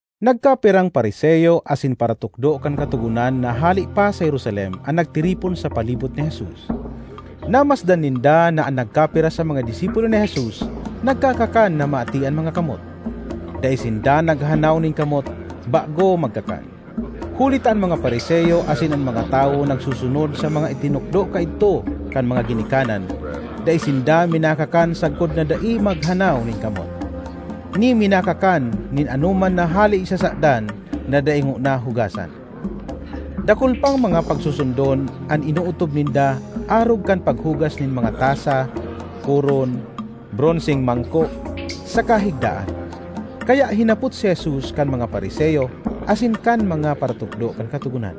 Nagkapirang Fariseo asin paratukdo kan Katogonan na hale pa sa Jerusalem an nagtiripon sa palibot ni Jesus. Namasdan ninda na an nagkapira sa mga disipulo ni Jesus nagkakakan na maati an mga kamot; dai sinda naghanaw nin kamot bago magkakan. (Huli ta an mga Fariseo asin an mga tawo nagsusunod sa mga itinukdo kaidto kan mga ginikanan: dai sinda minakakan sagkod na dai maghanaw nin kamot, ni minakakan nin anoman na hale sa sadan na dai ngona hugasan. Dakul pang mga pagsusundon an inootob ninda arog kan paghugas nin mga tasa, koron, bronseng mangko, saka higdaan). Kaya hinapot si Jesus kan mga Fariseo asin kan mga paratukdo kan Katogonan,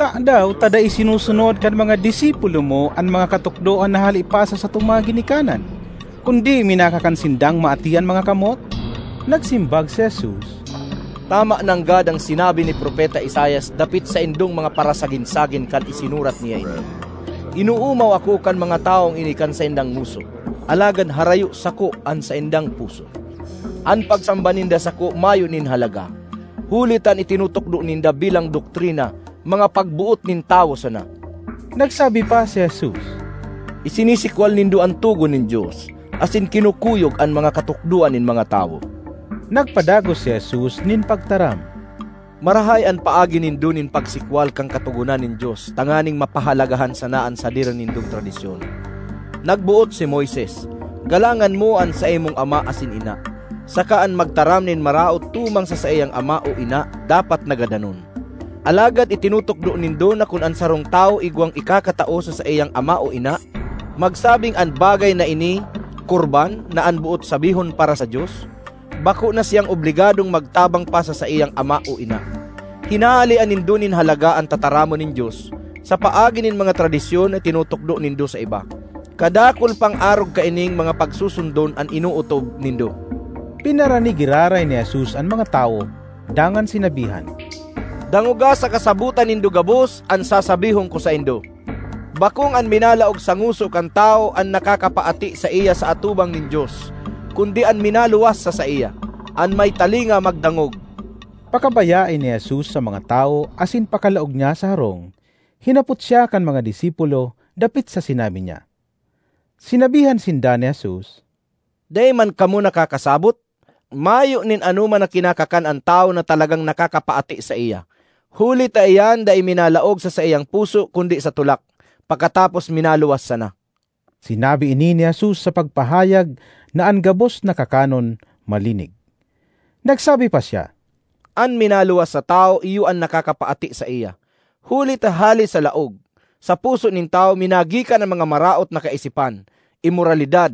“Tadaw ta dai sinusunod kan mga disipulo mo an mga katukdoan na hale pa sa satong mga ginikanan, kundi minakakan sindang maati an mga kamot?” Nagsimbag si Jesus, “Tama nanggad an sinabi ni Propeta Isaias dapit saindong mga parasagin-sagin kan isinurat niya ini: ‘Inoomaw ako kan mga tawong ini kan saindang ngoso, alagad harayo sako an saindang puso. An pagsamba ninda sako mayo nin halaga, huli ta an itinutukdo ninda bilang doktrina, mga pagboot nin tawo sana!’” Nagsabi pa si Jesus, “Isinisikwal nindo an togon nin Dios asin kinukuyog an mga katukdoan nin mga tawo.” Nagpadagos si Jesus nin pagtaram, “Marahay an paagi nindo nin pagsikwal kan katogonan nin Dios tanganing mapahalagahan sana an sadiri nindong tradisyon! Nagboot si Moises, ‘Galangan mo an saimong ama asin ina,’ saka ‘An magtaram nin maraot tumang sa saiyang ama o ina, dapat na gadanon.’ Alagad itinutukdo nindo na kun an sarong tawo igwang ikakatao sa saiyang ama o ina magsabing ‘an bagay na ini Corban’ (na an boot sabihon, para sa Dios), bako na siya obligadong magtabang pa sa saiyang ama o ina. Hinahalean nindo nin halaga an tataramon nin Dios sa paagi nin mga tradisyon na itinutukdo nindo sa iba. Kadakul pang arog kaining mga pagsusundon an inootob nindo.” Pinarani giraray ni Jesus an mga tawo dangan sinabihan, “Dangoga saka sabota nindo gabos an sasabihon ko saindo. Bakong an minalaog sa ngoso kan tawo an nakakapaati saiya sa atubang nin Dios kundi an minaluwas sa saiya. An may talinga magdangog!” Pakabayae ni Jesus sa mga tawo asin pakalaog niya sa harong, hinapot siya kan mga disipulo dapit sa sinabi niya. Sinabihan sinda ni Jesus, “Dai man kamo nakakasabot? Mayo nin anoman na kinakakan an tawo na talagang nakakapaati saiya, huli ta iyan dai minalaog sa saiyang puso kundi sa tulak, pakatapos minaluwas sana.” (Sinabi ini ni Jesus sa pagpahayag na an gabos na kakanon malinig.) Nagsabi pa siya, “An minaluwas sa tawo iyo an nakakapaati saiya, huli ta hale sa laog, sa puso nin tawo, minagikan an mga maraot na kaisipan, imoralidad,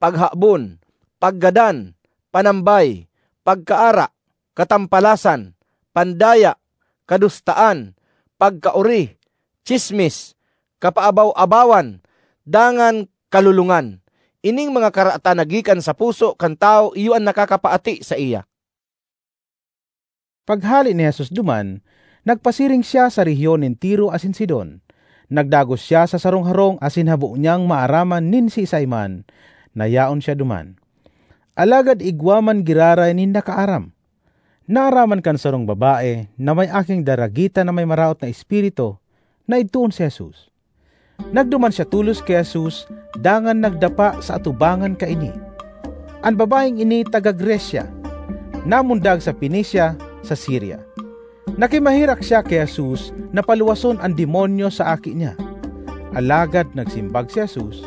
paghabon, paggadan, panambay, pagkaara, katampalasan, pandaya, kadustaan, pagkaori, tsismis, kapaabaw-abawan dangan, kalolongan. Ining mga karatan na gikan sa puso kan tawo iyo an nakakapaati saiya.” Paghale ni Jesus duman, nagpasiring siya sa rehiyon nin Tiro asin Sidon. Nagdagos siya sa sarong harong asin habo niyang maaraman nin siisay man na yaon siya duman; alagad igwa man giraray nin nakaaram. Naaraman kan sarong babae, na may aking daragita na may maraot na espiritu, na idtoon si Jesus. Nagduman siya tolos ki Jesus dangan nagdapa sa atubangan kaini. An babaeng ini taga Grecia, namundag sa Fenecia, sa Siria. Nakimaherak siya ki Jesus na paluwason an demonyo sa aki niya. Alagad nagsimbag si Jesus,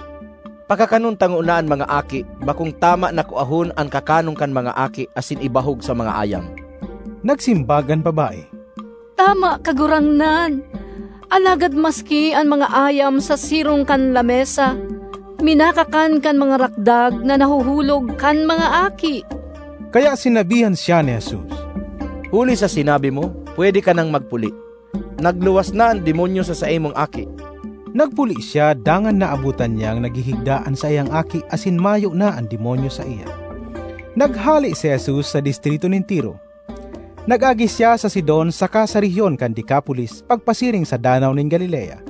“Pakakanon ta ngona an mga aki; bakong tama na kuahon an kakanon kan mga aki asin ibahog sa mga ayam.” Nagsimbag an babae, “Tama, Kagurangnan; alagad maski an mga ayam sa sirong kan lamesa minakakan kan mga rakdag na nahuhulog kan mga aki!” Kaya sinabihan siya ni Jesus, “Huli sa sinabi mo, pwede ka nang magpuli. Nagluwas na an demonyo sa saimong aki!” Nagpuli siya dangan naabotan niyang naghihigda an saiyang aki asin mayo na an demonyo saiya. Naghale si Jesus sa distrito nin Tiro. Nag-agi siya sa Sidon saka sa rehiyon kan Decapolis pagpasiring sa Danaw nin Galilea.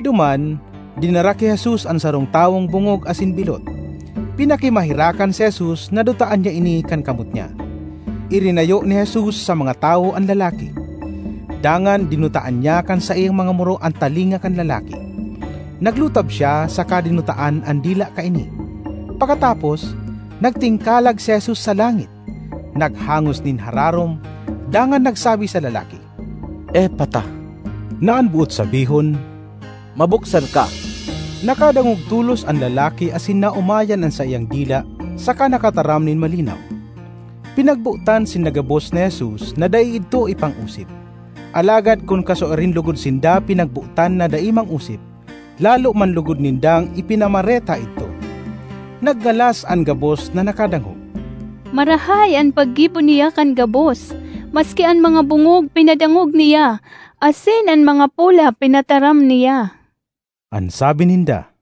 Duman, dinara ki Jesus an sarong tawong bongog asin bilot; pinakimaherakan si Jesus na dutaan niya ini kan kamot niya. Irinayo ni Jesus sa mga tawo an lalaki. Dangan dinutaan niya kan saiyang mga muro an talinga kan lalaki, naglutab siya saka dinutaan an dila kaini. Pakatapos, nagtingkalag si Jesus sa langit, naghangos nin hararom, dangan nagsabi sa lalaki, “Effata”, na an boot sabihon, “Mabuksan ka!” Nakadangog tolos an lalaki asin naomayan an saiyang dila saka nakataram nin malinaw. Pinagbotan sinda gabos ni Jesus na dai idto ipang-osip; alagad kun kasuarin logod sinda pinagbotan na dai mang-osip, lalo man logod nindang ipinamareta idto. Nagngalas an gabos na nakadangog, “Marahay an paggibo niya kan gabos; maski an mga bongog pinadangog niya asin an mga pola pinataram niya,” an sabi ninda.